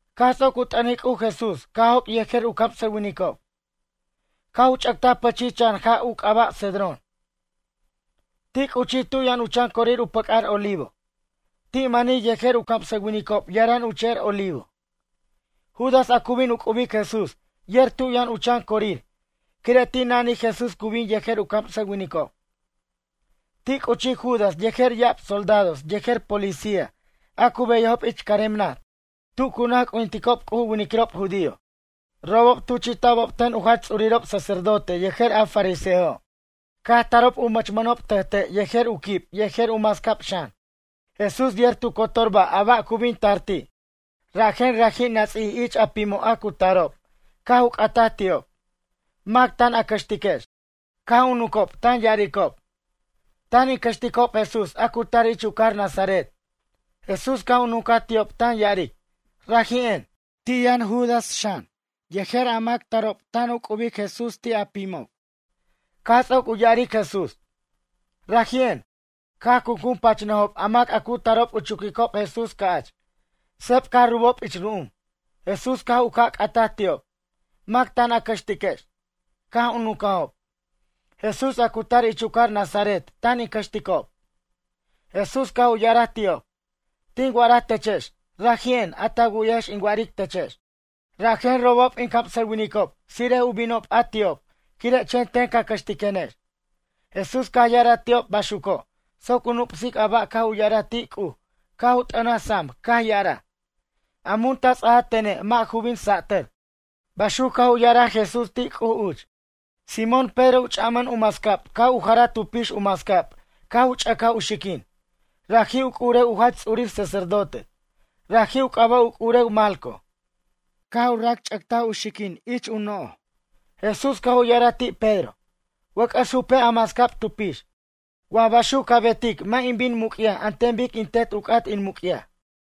Caj ts'oc u t'ʌnic C'uj Jesús caj joc' yejer u camsʌwinicob. Caj u ch'ʌctaj pʌchij chan ja' u c'aba' Cedrón. Ti' c'uchij tu' yʌn u chan corir u pʌc'ar Olivo. Ti' mani yejer u camsʌwinicob yaran u che'er Olivo. Judas a cu bin u c'ubic Jesús yer tu yʌn u chan corir quire' ti' nanij Jesús cu bin yejer u camsʌwinicob. Ti' c'uchij Judas yejer ya'ab soldados yejer policía a cu beyajob ich carem naj tu cu naj c'ujinticob C'uj u winiquirob judío. Robob tuchi'ta'b ten u jach ts'urirob sacerdote yejer a fariseojo'. Caj tarob u mʌchmʌnob tʌjte' yejer u quib yejer u mascab xan. Jesús yer tu cotor ba' a ba' cu bin tar ti' rajen raji' nats'ij ich a pimo' a cu tarob caj u c'ataj ti'ob: ―Mac tan a cʌxtiquex? Caj u nuncob tan ya'aricob: ―Tan in cʌxticob Jesús a cu tar ich u cajar Nazaret. Jesús caj u nuncaj ti'ob tan ya'aric: ―Raji'en. Ti' yʌn Judas xan yejer a mac tarob tan u c'ubic Jesús ti' a pimob. Caj ts'oc u ya'aric Jesús: “Raji'en”, caj cuncun pachnʌjob a mac a cu tarob u chuquicob Jesús ca'ch. Sep caj rubob ich ru'um. Jesús caj u ca' c'ataj ti'ob: ―Mac tan a cʌxtiquex? Caj u nuncajob: ―Jesús a cu tar ich u cajar Nazaret tan in cʌxticob. Jesús caj u ya'araj ti'ob: ―Tin wa'araj techex, raji'en a ta wu'yajex in wa'aric techex. Rajen robob in camsʌwinicob tsire'ej u binob a ti'ob quire' chen ten ca cʌxtiquenex. Jesús caj ya'araj ti'ob baxuco' soc u nup'sic a ba' caj u ya'araj ti' C'uj caj u t'ʌnaj sam caj ya'araj: “A mun ta ts'aja tene' mʌ' ju bin sa'tʌr”, baxuc caj u ya'araj Jesús ti' C'uj uch. Simón Pedro u ch'a'mʌn u mascab caj u jarar tu pix u mascab caj u ch'ʌcaj u xiquin, raji' u c'urew u jach ts'urir sacerdote. Raji' u c'aba' u c'urew Malco. Caj u racch'ʌctaj u xiquin ich u no'oj. Jesús caj u ya'araj ti' Pedro: ―Wʌc'ʌs jupej a mascab tu pix. Wa baxuc ca betic mʌ' in bin in muc'yaj an ten bic in Tet u c'at in muc'yaj.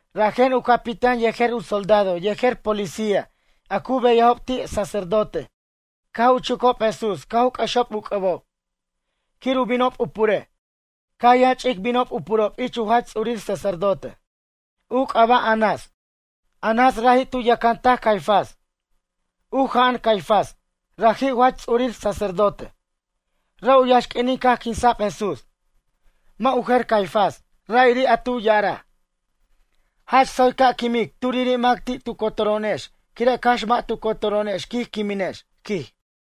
Rajen u capitán yejer u soldado yejer policía a cu beyajob ti' sacerdote caj u chucob Jesús caj u c'ʌxob u c'ʌbob, quir u binob u purej. Caj yʌn ch'ic binob u purob ich u jach ts'urir sacerdote, u c'aba' Anás. Anás, raji' tu yʌcantaj Caifás. U ja'an Caifás, raji' u jach ts'urir sacerdote, ra' u yaxq'uinin caj quinsa'b Jesús. Mʌ' u jer Caifás, ra'iri' a tu ya'araj: ―Jach tsoy ca' quimic turiri' mac ti' tu cotoro'onex quire' cax mʌ' tu cotoro'onex quij quiminex ―quij.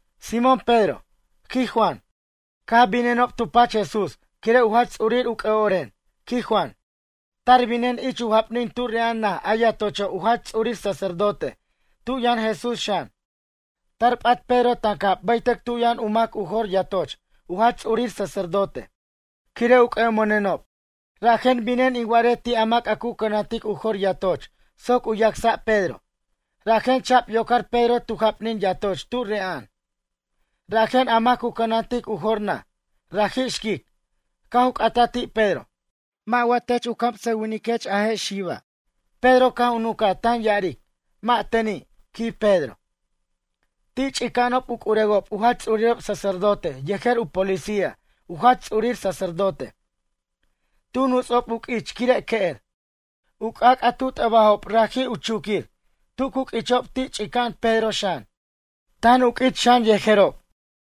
Simón Pedro, quij Juan, caj binenob tu pach Jesús quire' u jach ts'urir u c'ʌ'oren, quij Juan. Tar binen ich u japnin tu re'a'an naj a yatocho' u jach ts'urir sacerdote tu yʌn Jesús xan. Tar p'at Pedro tancab bʌytʌc tu' yʌn u mac u jor yatoch u jach ts'urir sacerdote. Quire' u c'ʌ'omʌnenob, rajen binen in wa'arej ti' a mac a cu cʌnantic u jor yatoch soc u yacsa' Pedro. Rajen cha'b yocar Pedro tu japnin yatoch tu re'a'an. Rajen a mac cu cʌnantic u jor naj, raji' xquic, caj u c'ataj ti' Pedro: ―Mʌ' wa tech u camsʌwiniquech a je' xiba'? Pedro caj u nuncaj tan ya'aric: ―Mʌ' teni' ―quij Pedro. Ti' ch'ica'anob u c'urewob u jach ts'urir sacerdote yejer u policía u jach ts'urir sacerdote. Tu nuts'ob u q'uich quire' que'er. U c'ac' a tu t'ʌbajob raji' u chuquir. Tu cu q'uichob ti' ch'ica'an Pedro xan, tan u q'uich xan yejerob.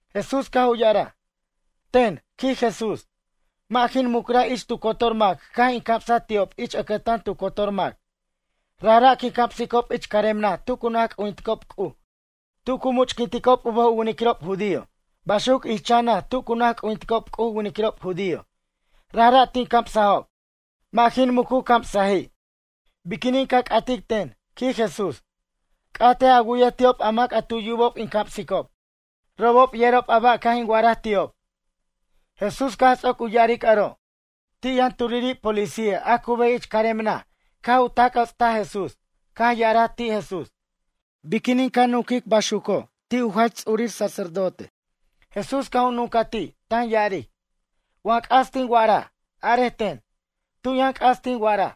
Jesús caj u ya'araj: ―Ten ―quij Jesús―, mʌ' jin mucraj ich tu cotor mac caj in camsaj ti'ob ich ʌcʌtan tu cotor mac. Rajra' quin camsicob ich carem naj tu cu naj c'ujinticob C'uj tu cu much'quinticob u bʌj u winiquirob judío. Baxuc ich chan naj tu cu naj c'ujinticob C'uj u winiquirob judío, rajra' tin camsajob. Mʌ' jin muc u camsaji'. Biquinin ca c'atic ten? ―quij Jesús―. C'atej a wu'yej ti'ob a mac tu yubob in camsicob. Robob yerob a ba' caj in wa'araj ti'ob. Jesús caj ts'oc u ya'aric aro', ti' yʌn turiri' policía a cu beyaj ich carem naj caj u tac' jʌtstaj Jesús, caj ya'araj ti' Jesús: ―Biquinin ca nunquic baxuco' ti' u jach ts'urir sacerdote? Jesús caj u nuncaj ti' tan ya'aric: ―Wa c'as tin wa'araj, arej ten. Tu' yʌn c'as tin wa'araj?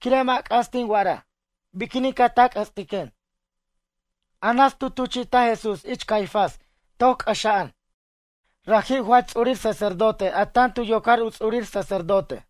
Quire' mʌ' c'as tin wa'araj. Biquinin ca tac' jʌtstiquen? Anás tu tuchi'taj Jesús ich Caifás toc c'ʌxa'an. Raji' u jach ts'urir sacerdote a tan tu yocar u ts'urir sacerdote.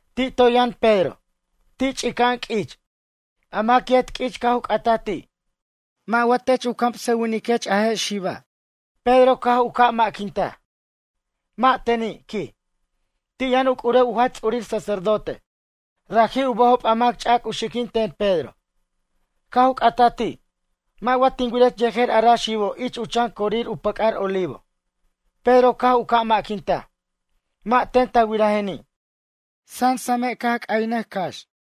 Ti' toy yʌn Pedro, ti' ch'ica'an q'uich. A mac yet q'uich caj u c'ataj ti': ―Mʌ' wa tech u camsʌwiniquech a je' xiba'? Pedro caj u ca' ma'quintaj: ―Mʌ' teni' ―quij. Ti' yʌn u c'urew u jach ts'urir sacerdote. Raji' u bʌjob a mac ch'ac u xiquin ten Pedro. Caj u c'ataj ti': ―Mʌ' wa tin wirech yejer a ra xibo' ich u chan corir u pʌc'ar Olivo? Pedro caj u ca' ma'quintaj: ―Mʌ' ten ta wirajeni'. Sasame' caj c'aynʌj cax.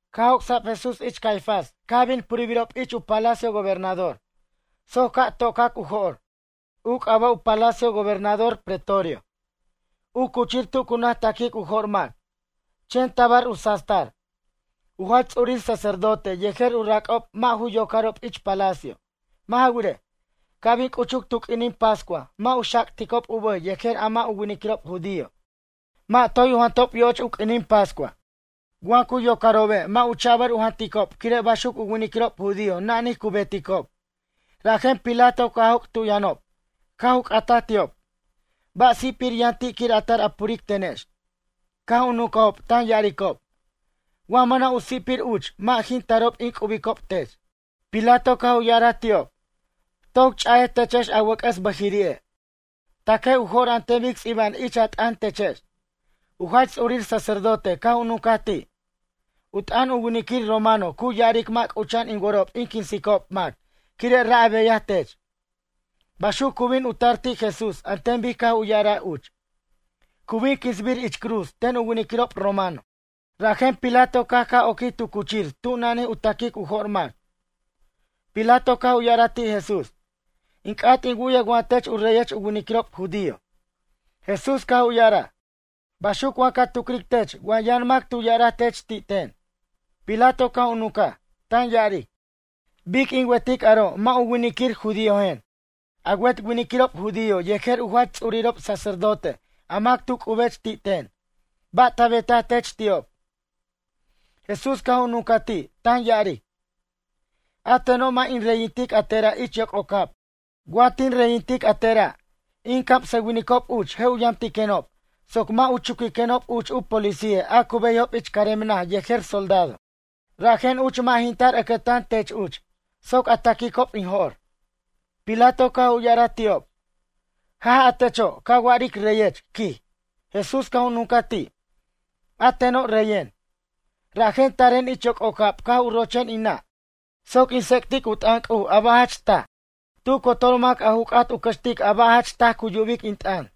Caj joc'sa'b Jesús ich Caifás caj bin purbirob ich u palacio gobernador soc ca' to'cac u jo'r. U c'aba' u palacio gobernador pretorio, u cuchir tu cu naj ta'quic u jo'r mac. Chen tabar u sastar. U jach ts'urir sacerdote yejer u rac'ob mʌ' ju yocarob ich palacio. Mʌ' ja wirej, ca' bin c'uchuc tu q'uinin pascua mʌ' u xac'ticob u bʌj yejer a mʌ' u winiquirob judío. Mʌ' toy u jantob yoch u q'uinin pascua. Wa cu yocarobe' mʌ' u cha'bʌr u janticob quire' baxuc u winiquirob judío nanij cu beticob. Rajen Pilato caj joc' tu' yʌnob, caj u c'ataj ti'ob: ―Ba' si'pir yʌn ti' quir a tar a puric tenex? Caj u nuncajob tan ya'aricob: ―Wa mʌna' u si'pir uch mʌ' jin tarob in c'ubicob tech. Pilato caj u ya'araj ti'ob: ―Toc ch'a'ej techex a wʌc'ʌs bʌjiri'e'. Ta'quej u jo'r an ten bic ts'iba'an ich a t'ʌn techex. U jach ts'urir sacerdote caj u nuncaj ti': ―U t'ʌn u winiquir romano cu ya'aric mʌ' c'ucha'an in worob in quinsicob mac quire' ra' a beyaj tech. Baxuc cu bin u tar ti' Jesús an ten bic caj u ya'araj uch. Cu bin quinsbir ich cruz ten u winiquirob romano. Rajen Pilato caj ca' oquij tu cuchir tu nanij u ta'quic u jo'r mac. Pilato caj u ya'araj ti' Jesús: ―In c'at in wu'yej wa tech u reyech u winiquirob judío? Jesús caj u ya'araj: ―Baxuc wa ca tucric tech wa yʌn mac tu ya'araj tech ti' ten? Pilato caj u nuncaj, tan ya'aric: ―Bic in wetic aro' mʌ' u winiquir judíojen. A wet winiquirob judío yejer u jach ts'urirob sacerdote a mac tu c'ubech ti' ten. Ba' ta betaj tech ti'ob? Jesús caj u nuncaj ti' tan ya'aric: ―A teno' mʌ' in reyintic a tera' ich yoc'ocab. Wa tin reyintic a tera', in camsʌwinicob uch je' u yamtiquenob soc mʌ' u chuquiquenob uch u policía a cu beyajob ich carem naj yejer soldado. Rajen uch mʌ' jin tar ʌcʌtan tech uch soc a ta'quicob in jo'r. Pilato caj u ya'araj ti'ob: ―Jaj a techo' ca wa'aric reyech ―quij. Jesús caj u nuncaj ti': ―A teno' reyen, rajen taren ich yoc'ocab caj u rochen in nʌ' soc in tsec'tic u t'ʌn C'uj a ba' jach taj. Tu cotor mac a ju c'at u cʌxtic a ba' jach taj cu yubic in t'ʌn.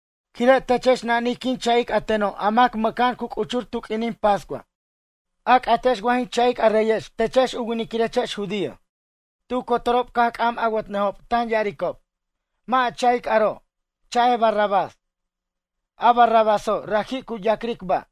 Quire' techex nanij quin cha'ic a teno' a mac mʌca'an cu c'uchur tu q'uinin pascua. A c'atex wa jin cha'ic a reyex techex u winiquirex judío? Tu cotorob caj c'am awʌt'nʌjob tan ya'aricob: ―Mʌ' a cha'ic aro', cha'ej Barrabás. A Barrabáso' raji' cu ya'cric ba'.